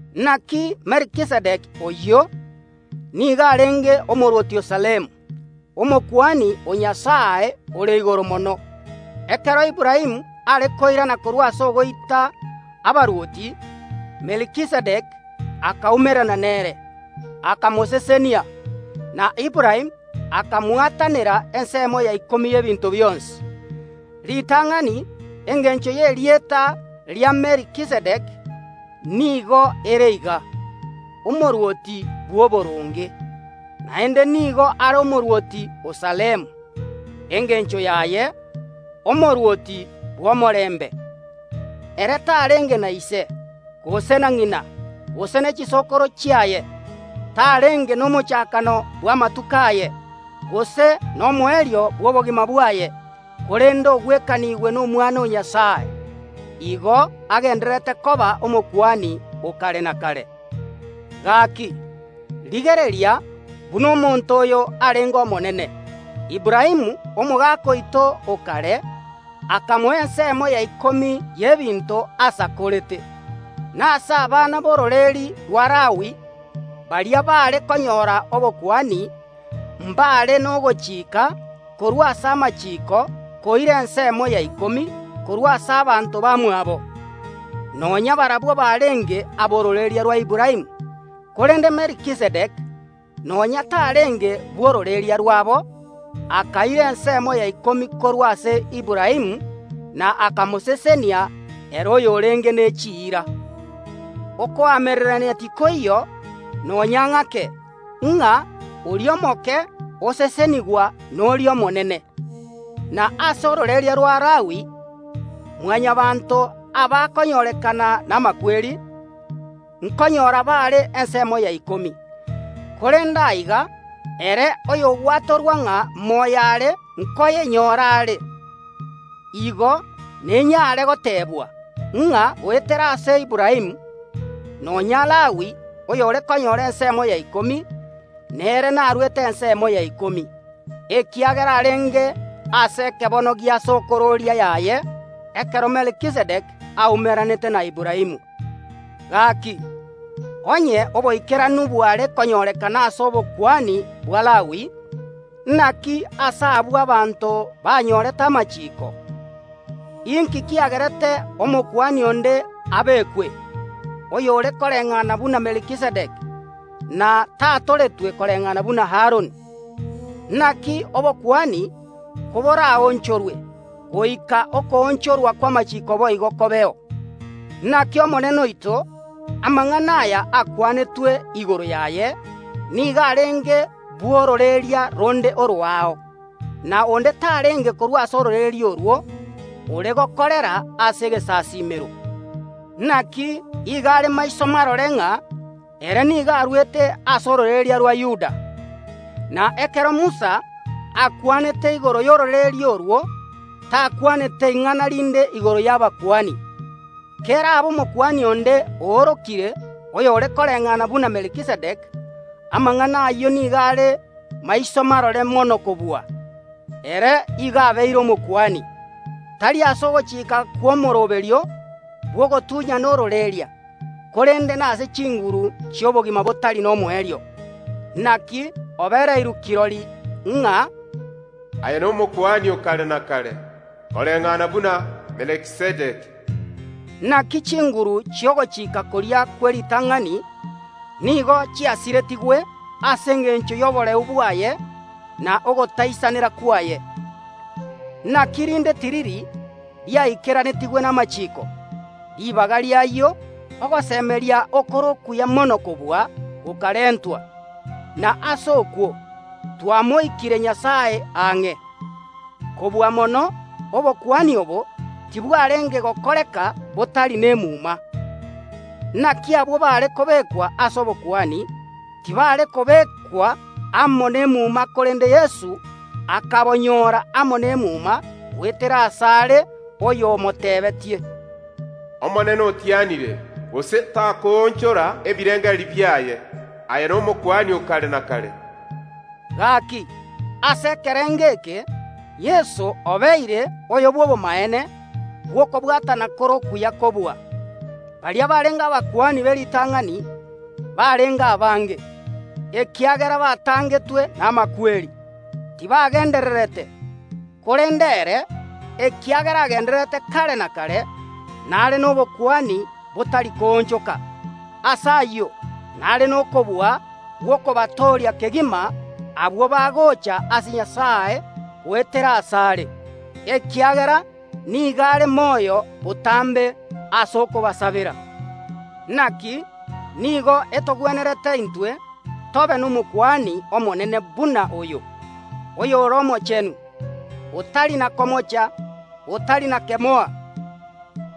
Naki Melkizedeki oyio nigo arenge omorwoti o Salemu, Omokuani o Nyasae Ore Igoro Mono. Ekero Aburaamu are koirana korwa ase ogoita abarwoti, Melkizedeki akaumerana nere, akamosesenia. Na Aburaamu akamwatanera ensemo ya ikomi y’ebinto bionsi. Ritang’ani engencho y’erieta ria Melkizedeki nigo ere iga: “Omorwoti bw’oboronge”, naende nigo are omorwoti o Salemu, engencho yaye: “Omorwoti bw’omorembe”. Ere tarenge na ise, gose na ng’ina, gose ne chisokoro chiaye; tarenge nomochakano bw’amatuko aye, gose nomoerio bw’obogima bwaye, korende ogwekanigwe n’Omwana o Nyasae. Igo agendererete koba Omokuani o kare na kare. Gaki, rigereria buna omonto oyo arenge omonene! Aburaamu, omogaka oito o kare, akamoa ensemo ya ikomi y’ebinto asakorete korwa ase esegi. Na ase abana b’ororeria rwa Lawi, baria baare konyora obokuani, mbaare nogochika korwa ase amachiiko koira ensemo ya ikomi korwa ase abanto bamwabo, nonya barabwo barenge ab’ororeria rwa Aburaamu. Korende Melkizedeki, nonya tarenge bw’ororeria rwabo, akaira ensemo ya ikomi korwa ase Aburaamu, na akamosesenia ere oyorenge ne chiira. Okoamererania tikoiyo nonya ng’ake ng’a oria omoke osesenigwa noria omonene. Na ase ororeria rwa Lawi Mwanyabaanto, abakonyorekana namakweri, nkonyora bare ensemo ya ikomi, korende aiga ere oyogwatorwa ng’a moyo are nkoyenyora are. Igo nenyare gotebwa, ng’a goetera ase Aburaamu nonya Lawi, oyore konyora ensemo ya ikomi, nere naruete ensemo ya ikomi, ekiagera arenge ase ekebono gia sokororia yaye, ekero Melkizedeki aumeranete na Aburaamu. Gaki, onye oboikeranu bware konyorekana ase obokuani bwa Lawi, naki ase obwo abanto banyorete amachiiko, inki kiagerete Omokuani onde abekwe, oyore koreng’ana buna Melkizedeki, na tatoretwe koreng’ana buna Aroni? Naki obokuani koboraonchorwe, goika okoonchorwa kw’amachiiko boigo kobeo. Naki omonene oito, amang’ana aya akwanetwe igoro yaye, nigo arenge bw’ororeria ronde oroao, na onde tarenge korwa ase ororeria orwo ore gokorera ase egesasiimero. Naki igo are maiso marore ng’a ere nigo arwete ase ororeria rwa Yuda. Na ekero Musa akwanete igoro y’ororeria orwo takwanete ing’ana rinde igoro y’abakuani. Kerabe Omokuani onde oorokire oyore koreng’ana buna Melkizedeki amang’ana ayio nigo are maiso marore mono kobua. Ere igo obeire Omokuani, tari ase ogochika kw’omooroberio bw’ogotunyana ororeria, korende nase chinguru chi’obogima botari nomoerio. Naki obereirwe kirori ng’a. “Aye n’Omokuani o kare na kare, koreng’ana buna Melkizedeki.” Naki chinguru chi’ogochika koria kw’eritang’ani nigo chiasiretigwe ase engencho y’oboreu bwaye na ogotaisanera kwaye. Naki rinde tiriri riaikeranetigwe namachiiko. Ribaga ri’ayio ogosemeria okore okuya mono kobua gokarentwa, na ase okwo twamoikire Nyasae ang’e. Kobua mono obokuani obo tibwarenge gokoreka botari nemuma. Naki abwo baare kobekwa ase obokuani tibare kobekwa amo nemuma, korende Yeso akabonyora amo nemuma goetera asare oyo omotebetie, “Omonene otianire, gose takoonchora ebirengererio biaye, Aye n’Omokuani o kare na kare.” Gaki, ase ekerengo eke Yeso obeire oyo bw’obomaene bw’okobwatana kore okuya kobua. Baria barenge abakuani b’eritang’ani barenge abange, ekiagera batangetwe namakweri, tibagendererete, korende ere, ekiagera agendererete kare na kare, nare nobokuani botari koonchoka. Ase ayio, nare nokobua gw’okobatooria kegima abwo bagocha ase Nyasae goetera asare, ekiagera nigo are moyo botambe ase okobasabera. Naki nigo etogwenerete intwe tobe n’Omokuani Omonene buna oyo, oyore omochenu, otari na komocha, otari na kemoa,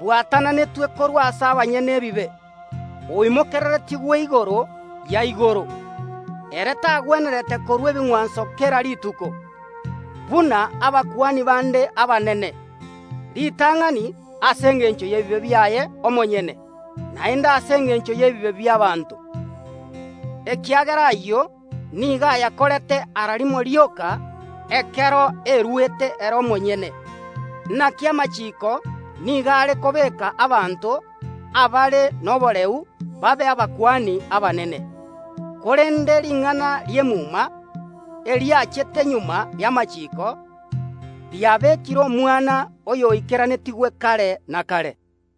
bwatananetwe korwa ase abanyene ebibe, oimokereretigwe igoro ya igoro. Ere tagwenerete korua ebing’wanso kera rituko, buna abakuani bande abanene, ritang’ani ase engencho y’ebibe biaye omonyene, naende ase engencho y’ebibe bi’abaanto, ekiagera ayio nigo ayakorete ara rimo rioka ekero eruete ere omonyene. Naki amachiiko nigo are kobeeka abanto abare noboreu babe abakuani abanene, korende ring’ana ri’emuma, eriachete magega y’amachiiko, riabekire Omwana, oyoikeranetigwe kare na kare.